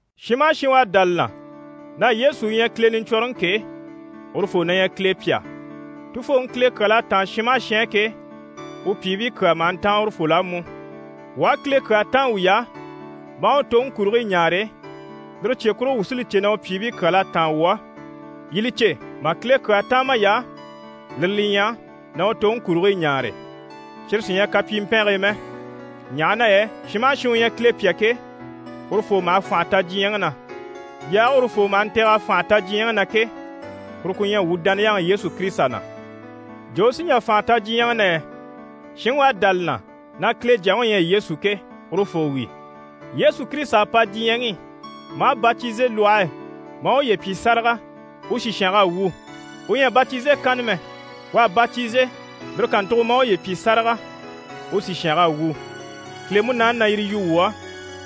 Shin maha shin u à dá li na na Yesu u ɲyɛ Kile Niɲcwɔnrɔŋi ke, urufoo na ɲyɛ Kile pyà. Tufooŋi Kile kyal'à táan shin maha shin á ke, u pyìibii kyaa maha ntáan urufol'á mú. Wuu aha Kile kyaa táan wuy'á, maa u toŋi kurigii ɲaare, lire cye kurugo wuu sí li cè na u pyìibii kyal'à táan wuu á. Yii li cè, mà Kile kyaa táan may'á, lire li ɲyɛ: na u toŋi kurigii ɲaare. Cyire sí ɲyɛ kapyimpɛngii mɛ, ɲaha na yɛ shin maha shin u ɲyɛ Kile pyà ke, urufoo maha fànha ta diɲyɛŋi na. Yaage urufoo maha ntɛ̀g'a fànha ta diɲyɛŋi na ke, kuru ku ɲyɛ wuu dániyaŋi Yesu Kirisita na. Jo u sí n‑jà fànha ta diɲyɛŋi na yɛ? Shinŋi u à dá li na na Kile Jyaŋi u ɲyɛ Yesu ke, urufoo wi. Yesu Kirisita à pa diɲyɛŋi i, maa batize lwɔhe e, maa uye pyi sáraga, u sìshang'à wu. U ɲyɛ a batize kanna mɛ, u à batize, lire kàntugo maa uye pyi sáraga, u sìshang'à wu. Kile Munaani na yire yu wuu á,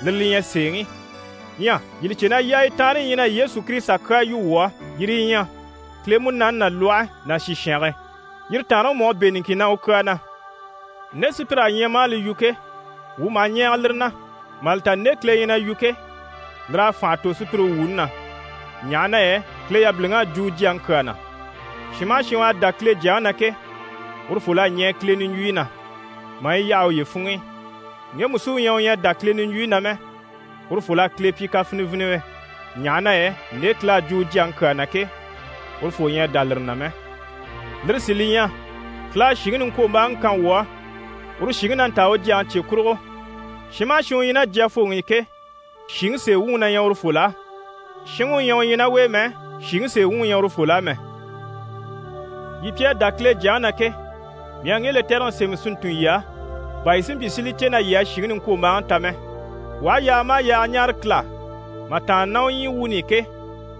lire li ɲyɛ sèeŋi. Ɲyɛ yii li cè na yaayi taanre yi ɲyɛ na Yesu Kirisita kyaa yu wuu á, yire yi ɲyɛ: Kile Munaani ná lwɔhe ná sìshange. Yire taanreŋi mú s'à bɛ̂ niŋkin na u kyaa na. Nde sùpyir'à ɲya maa li yu ke, wuu maha ɲɛɛge lire na, mà li ta nde Kile ɲyɛ na yu ke, lir'à fànha tò sùpyire wuuni na, ɲaha na yɛ Kile yabiliŋ'à jwo u Jyaŋi kyaa na. Shin maha shin u à dá Kile Jyaŋi na ke, urufol'à ɲɛɛ Kile niɲjwuyi na, maa yi yaha uye funŋ'i. Ŋgemu sí u ɲyɛ u ɲyɛ a dá Kile niɲjwuyi na mɛ, urufol'à Kile pyi kafiniviniwe, ɲaha na yɛ nde Kile à jwo u Jyaŋi kyaa na ke, urufoo ɲyɛ a dá lire na mɛ. Lire sí li ɲyɛ: Kile à shìŋi niŋkwombaaŋi kan wuu á, uru shìŋi na ntaa u Jyaŋi cye kurugo. Shin maha shin u ɲyɛ ná Jyafooŋi i ke, shìŋi sèe wuŋi na ɲyɛ urufol'á. Shinŋi u ɲyɛ u ɲyɛ ná u e mɛ, shìŋi sèe wuŋi ɲyɛ urufol'á mɛ. Yii pi à dá Kile Jyaŋi na ke, mii à ŋge lɛtɛrɛŋi sémɛ si ntun yii á, bà yii si mpyi si li cè na yii à shìŋi niŋkwombaaŋi ta mɛ. Wuu aha yaaga maha yaaga ɲáare Kile á mà tàanna ná u ɲyii wuuni i ke,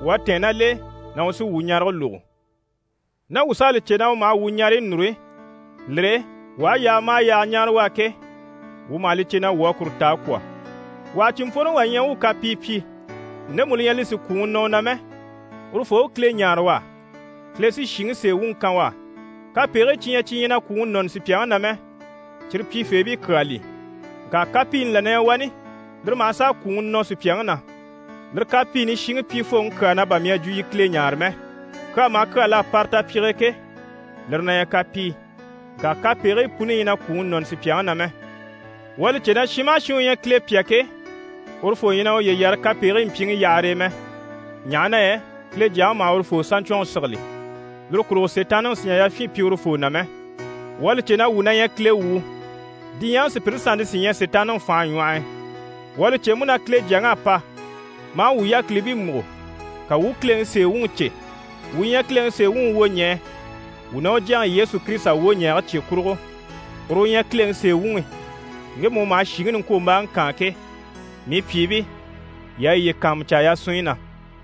wuu à tɛ̀ɛn ná l'e na u sí wuu ɲarege lógo. Ná wuu s'à li cè na u maha wuu ɲareyi núru, lire e, wuu aha yaaga maha yaaga ɲáare u á ke, wuu maha li cè na wuu à kuru ta a kwɔ̀. Wà ha cìnmpworoŋi wà ɲya u u kapii pyi, ndemu li ɲyɛ li sì kwùŋi nɔ u na mɛ, urufoo u Kile ɲáare u á. Kile sí shìŋi sèe wuŋi kan u á, kapegigii cyi ɲyɛ cyi ɲyɛ na kwùŋi nɔni sùpyaŋi na mɛ, cyire pyifeebii kyaa li. Ŋka kapiini là na ɲyɛ wani, lire maha sàa kwùŋi nɔ sùpyaŋi na. Lire kapiini shiŋi pyifooŋi kyaa na bà mii à jwo yii Kile ɲáare mɛ. Kyaa maha kyaa l'à para tapyige e ke, lire na ɲyɛ kapii. Ŋka kapegigii puni ɲyɛ na kwùŋi nɔni sùpyaŋi na mɛ. Wuu à li cè na shin maha shin u ɲyɛ Kile pyà ke, urufoo ɲyɛ na uye yare kapegigii mpyiŋi yahare e mɛ, ɲaha na yɛ Kile Jyaŋi maha urufoo saɲcwɔnŋi sigili, lire kurugo Sitaanniŋi sì n‑jà yafyin pyi urufoo na mɛ. Wuu à li cè na wuu na ɲyɛ Kile wuu, diɲyɛŋi sùpyire sannte sí ɲyɛ Sitaanniŋi fànhe ɲwɔh'i. Wuu à li cè mú na Kile Jyaŋi à pa, maa wuu yákilibii múgo, ka wuu u Kileŋi sèe wuŋi cè. Wuu ɲyɛ Kileŋi sèe wuŋi wwoɲɛɛ, wuu ná u Jyaŋi Yesu Kirisita wwoɲɛɛge cye kurugo. Uru u ɲyɛ Kileŋi sèe wuŋi, ŋgemu u maha shìŋi niŋkwombaaŋi kaan ke. Mii pyìibii, yii a yiye kàanmucaa yasunɲyi na.